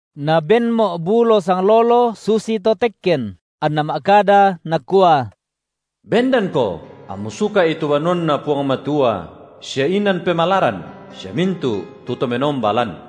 Nabenmo’ bulo sanglolo susito tekken, anna ma’kada, nakua: Bendanko ammu suka’i tu banuanNa Puang Matua sia inan pemalaran sia mintu’ tu to menomba lan.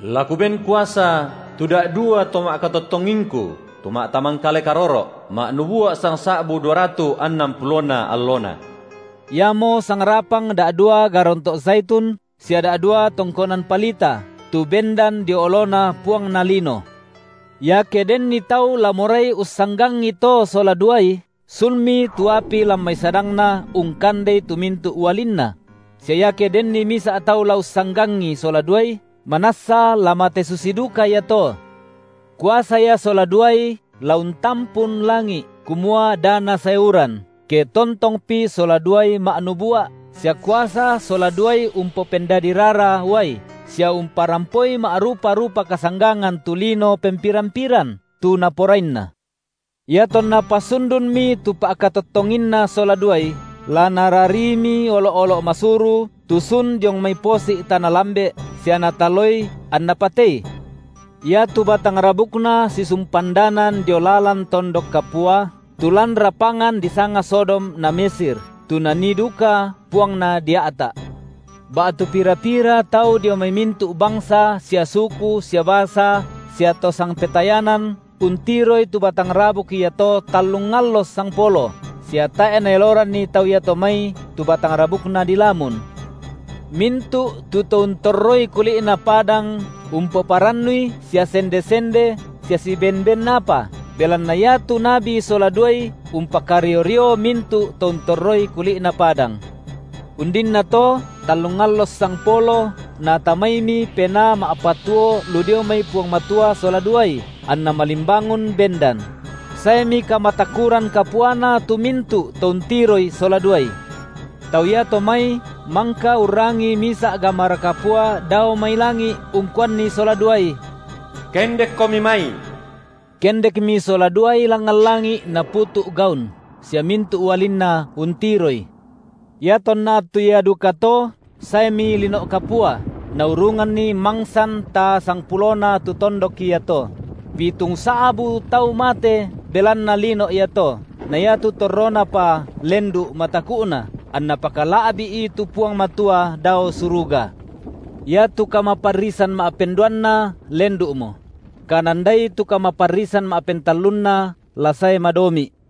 La Kuben kuasa tu da’dua to ma’katottongingKu tu ma’tamangkale karoro’, ma’nubua’ sangsa’bu duaratu’ annan pulona allona. Iamo sangrapang da’dua garonto’ saitun sia da’dua tongkonan palita, tu bendan dio oloNa Puangna lino. Iake denni tau la morai ussanggangi to sola duai, sunmi tu api lan mai sadangna ungkandei tu mintu’ ualinna; sia iake denni misa’ tau la ussanggangi sola duai, manassa la mate susi duka iato. Kuasa ia sola duai la untampun langi’, kumua da nasae uran, ke tontongpi sola duai ma’nubua’, sia kuasa sola duai umpopendadi rara uai, sia umparampoi ma’rupa-rupa kasanggangan tu lino pempiran-piran, tu naporainna. Iatonna pasundunmi tu pa’katottonginna sola duai, la narariimi olo’-olo’ masuru tu sun diong mai posi’ tana lambe’, sia nataloi anna patei. Iatu batang rabukna sisumpandanan dio lalan tondok kapua, tu lan rapangan disanga Sodom na Mesir, tu Nanii duka Puangna dia’ta’. Ba’tu pira-pira tau dio mai mintu’ bangsa sia suku sia basa sia to sangpetayanan untiroi tu batang rabuk iato tallung allo sangpolo, sia tae’ naeloranni tau iato mai tu batang rabukna dilamun. Mintu’ tu to untorroi kuli’na padang umpoparannui sia sende-sende sia siben ben apa, belanna iatu nabi sola duai umpakario-rio mintu’ to untorroi kuli’na padang. Undinnato tallung allo ssangpolo natamaimi penaa ma’patuo lu dio mai Puang Matua sola duai, anna malimbangun bendan; saemi kamatakuran kapuana tu mintu’ to untiroi sola duai. Tau iato mai mangka urrangi misa’ gamara kapua dao mai langi’ ungkuanni sola duai: Kendekkomi mai. Kendekmi sola duai langngan langi’ naputu’ gaun, sia mintu’ ualinna untiroi. Iatonna attu ia dukato saemi lino’ kapua, naurunganni mangsan taa sangpulona tu tondok iato; pitungsa’bu tau mate belanna lino’ iato, na iatu torronapa lendu’ mataku’na, anna pakala’bi’i tu Puang Matua dao suruga. Iatu kamaparrisan ma’penduanna lendu’mo; kanandai tu kamaparrisan ma’pentallunna la sae madomi’.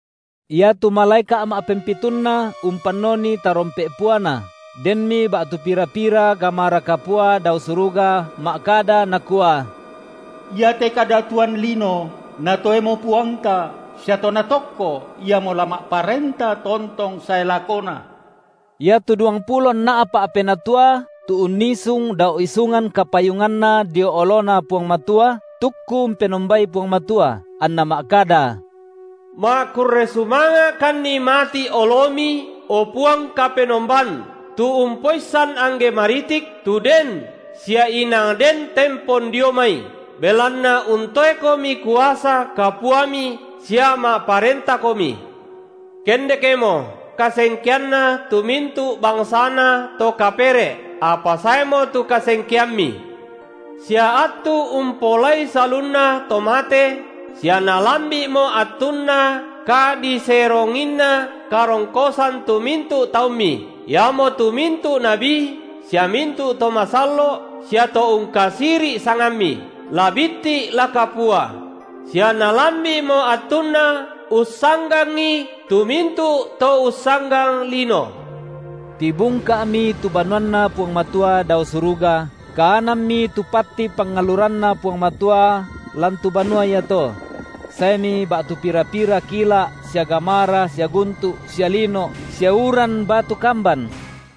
Iatu malaeka’ ma’pempitunna umpannoni tarompe’ puana, denmi ba’tu pira-pira gamara kapua dao suruga ma’kada nakua: Iate kadatuan lino natoemo Puangta sia To Natokko, Iamo la ma’parenta tontong sae lakona. Iatu duangpulo nna’pa’ penatua tu unnisung dao isungan kapayunganna dio oloNa Puang Matua tukku umpenombai Puang Matua, anna ma’kada: Ma’kurre sumanga’kanni mati’ oloMi, o Puang Kapenomban, tu Umpoissan angge maritik, tu den, sia inang den tempon dio mai, belanna untoeKomi kuasa kapuaMi sia ma’parentamoKomi. Kendekmo kasengkeanna tu mintu’ bangsana to kapere’, apa saemo tu kasengkeamMi, sia attu umpaolai salunna to mate, sia nalambi’mo attunna kadiseronginna karongkosan tu mintu’ taumMi, iamotu mintu’ nabi sia mintu’ to masallo’ sia to ungkasiri’ sangamMi, la bitti’ la kapua; sia nalambi’mo attunna ussanggangi tu mintu’ to ussanggang lino. Tibungka’mi tu banuanNa Puang Matua dao suruga, kaananmi tu patti pangalluranNa Puang Matua lan tu banua iato; saemi ba’tu pira-pira kila’ sia gamara sia guntu’ sia lino’ sia uran batu kamban.